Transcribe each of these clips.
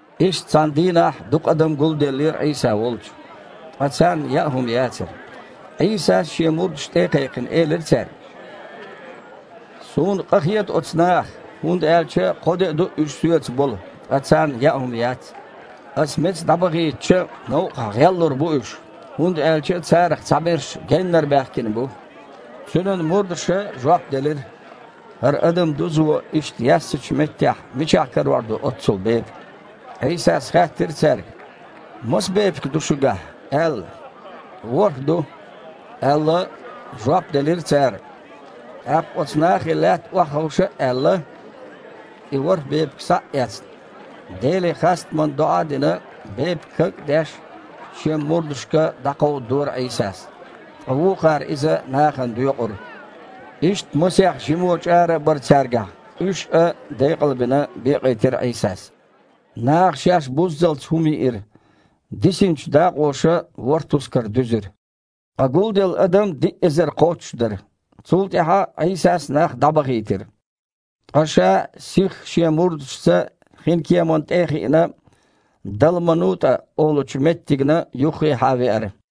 Иштта цхьана дийнахь дукха адам гулделлера Іийса волчу, ткъа царна яа хІума яцара. Іийсас, Шен мурдаш тІе а кхайкхина, элира цаьрга: «Суна къахета оцу нахах, хІунда аьлча кхо де а ду уьш Соьца болу, ткъа царна яа хІума яц. Аса меца дІабахийтича, новкъахь гІеллур бу уьш, хІунда аьлча царах цхьаберш геннара баьхкина бу». Цуьнан мурдаша жоп делира: «ХІара адам дузо иштта яьссачу меттехь мичахь карор ду оццул бепиг?» Іийсас хаьттира цаьрга: «Маса бепиг ду шуьгахь?» – аьлла. «ВорхІ ду», – аьлла, жоп делира цара. ТІаккха оцу нахе лаьтта охьаховша а аьлла, и ворхІ бепиг схьа а эцна, Деле хастаман доІа а дина, бепиг каг а деш, Шен мурдашка кховдадора Іийсас, ткъа вукхара иза нахана доькъура. Иштта масех жимо чІара а бара цаьргахь, уьш а, декъалбина, бекъийтира Іийсас. Наха шаьш буззалц хІума йиира. Дисинчу дакъоша ворхІ тускар дуьзира. Ткъа гулделла адам диъ эзар кхоччуш дара. Цул тІаьхьа Іийсас нах дІабахийтира, ткъа Ша, сихха Шен мурдашца хинкеман тІе а хиъна, ДалманутІа олучу меттигна юххехьа веара.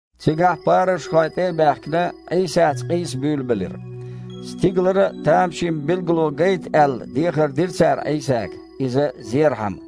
Цигахь парушхой, тІе а баьхкина, Іийсаца къийса буьйлабелира. Стигалара тамашийна билгало гайта аьлла дехар дира цара Іийсага, Иза зерхьама.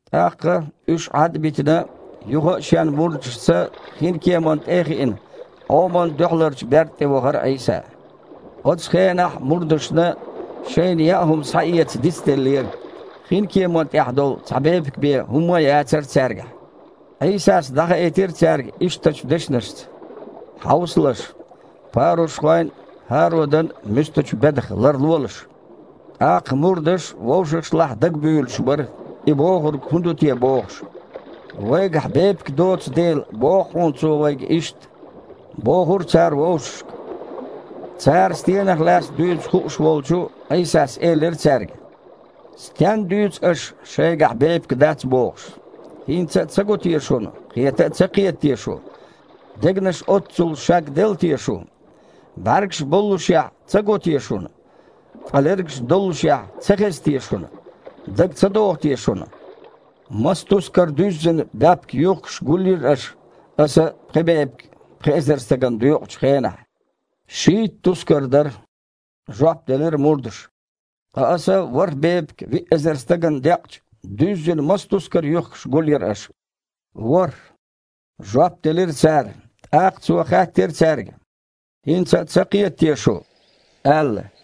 ТІаккха, уьш Іад а битина, юха а Шен мурдашца хинкеманна тІе а хиъна, Іоман дуьхьаларчу берда тІе вахара Іийса. Оцу хенахь мурдашна шайна яа хІума схьаэца дицделлера, хинкеман тІехь долу цхьа бепиг бен хІумма а яцара цаьргахь. Іийсас дІахаийтира цаьрга ишттачу дешнашца: «Хьовсалаш! Парушхойн а, ХІародан а муьстачу бедах ларлолаш». ТІаккха мурдаш вовшашлахь дагабуьйлуш бара, и бохург хІун ду те бохуш. «Вайгахь бепиг доцу дела боху хьуна Цо вайга иштта», – бохура цара вовшашка. Цара стенах лаьцна дуьйцу хууш волчу Іийсас элира цаьрга: «Стенна дуьйцу аша, шайгахь бепиг дац бохуш? ХІинца а ца го те шуна, кхета а ца кхета те шу? Дегнаш оццул шагделла те шун? БІаьргаш боллушехь, ца го те шуна? Ткъа лергаш доллушехь, ца хеза те шуна? Дага ца догІу те шуна, маса тускар дуьззина баьпкан юьхкаш гулйира аша, Аса пхи бепиг пхи эзар стагана доькъучу хенахь?» «Шийтта тускар дара», – жоп делира мурдаша. «Ткъа Аса ворхІ бепиг виъ эзар стагана декъча, дуьззина маса тускар юьхкаш гулйира аша?» «ВорхІ», – жоп делира цара. ТІаккха Цо хаьттира цаьрга: «ХІинца а ца кхета те шу?» – аьлла.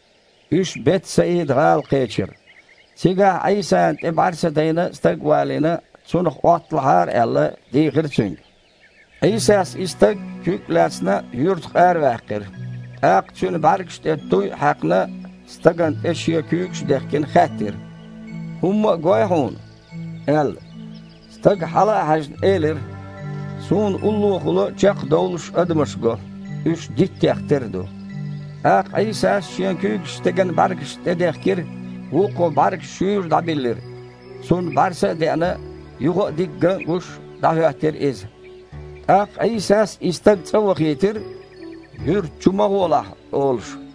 Уьш Бет-Саида-гІала кхечира. Цигахь Іийсана тІе бІаьрса дайна стаг а валийна, цунах Іотталахьара аьлла, дийхира Цуьнга. Іийсас и стаг, куьг а лаьцна, юьртах араваьккхира. ТІаккха цуьнан бІаьргаш тІе туй а хьаькхна, стагана тІе Шен куьйгаш а дехкина, хаьттира: «ХІумма а гой хьуна?» – аьлла. Стага, хьала а хьаьжна, элира: «Суна уллохула чекхдовлуш адамаш го. Уьш диттех тера ду». ТІаккха Іийсас Шен куьйгаш стеган бІаьргашна тІе дехкира, вукхо бІаьргаш шуьйра дІабиллира, цунна бІаьрса а деъна, юха а дика ган а гуш, дІахІоьттира иза. ТІаккха Іийсас и стаг цІа вахийтира: «Юьрта чу ма гІолахь», – олуш.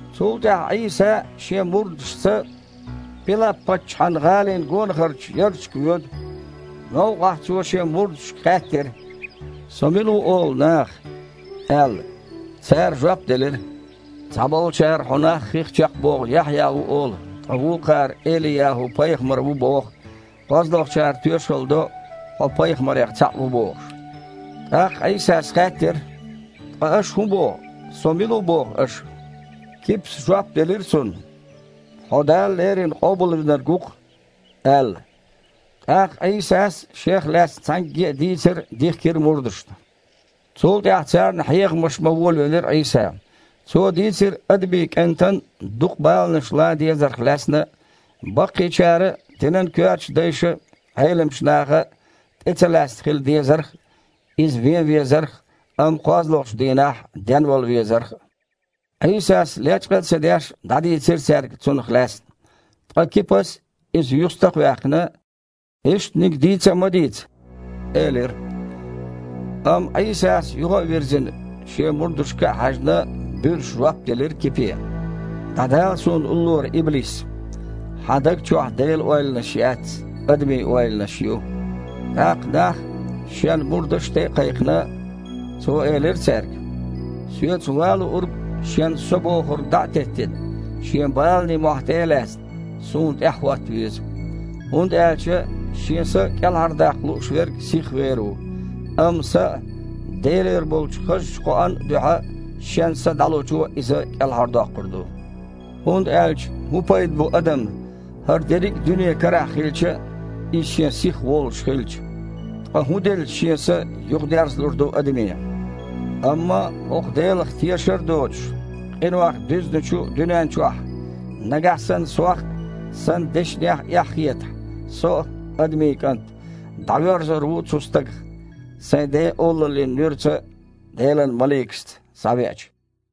Цул тІаьхьа Іийса Шен мурдашца Пилап-паччахьан гІалин гонахарчу ярташка воьду. Новкъахь Цо Шен мурдашка хаьттира: «Со мила ву олу наха?» – аьлла. Цара жоп делира: «Цхьаболчара Хьо нах хих чекхбоху Яхьъя ву олу, ткъа вукхара – Эли-ЯхІу-пайхамар ву боху, кхозлагІчара тоьшалла до, Хьо пайхамарех цхьаъ ву бохуш». ТІаккха Іийсас хаьттира: «Ткъа аша хІун боху, Со мила ву боху аша?» Кипас жоп делира Цунна: «Хьо Дала леррина Къобалвинарг ву-кх», – аьлла. ТІаккха Іийсас Шех лаьцна цхьаьнгге а дийцар дихкира мурдашна. Цул тІаьхьа царна хьехамаш бан волавелира Іийса. Цо дийцира Адамийн КІентан дукха баланаш лан дезарх лаьцна а, баккхийчара а, динан коьртачу дайша а, Іеламчу наха а тІе ца лаьцна хила дезарх а, Иза вен везарх а, амма кхозлагІчу дийнахь денвала везарх а. Іийсас, лечкъа а ца деш, дІадийцира цаьрга цунах лаьцна. Ткъа Кипас, Иза юьстах а ваьккхина: «Ишттаниг дийца а ма дийца», – элира. Амма Іийсас, юха а вирзина, Шен мурдашка а хьаьжна, буьрса жоп делира Кипе: «ДІадала Суна уллора, иблис! Хьан даг чохь Делан ойланаш яц, адамийн ойланаш ю». ТІаккха, нах а, Шен мурдаш а тІе а кхайкхина, Цо элира цаьрга: «Соьца ван луург, шен „со“ бохург дІа а теттина, шен баланийн мохь тІе а лаьцна, Суна тІаьхьахІотта веза. ХІунда аьлча шен са кІелхьардаккха лууш верг сих вер ву, амма Сан а, Делера болу хазачу кхоан а дуьхьа шен са дІалучо иза кІелхьардоккхур ду. ХІунда аьлча хІун пайда бу адамна, хІара дерриге а дуьне карахь хилча а, иза шен сих волуш хилча. Ткъа хІун делча, шен са юхадерзалур ду адаме? Амма хІокху Делах тешар а доцуш, къинойх дуьзначу дуьнен чохь, нагахь санна Сох а, Сан дешнех а эхь хетахь, Со а, Адамийн КІант, дІавоьрзур ву цу стагах, Сайн Ден олаллин нуьраца Делан маликашца схьавеача».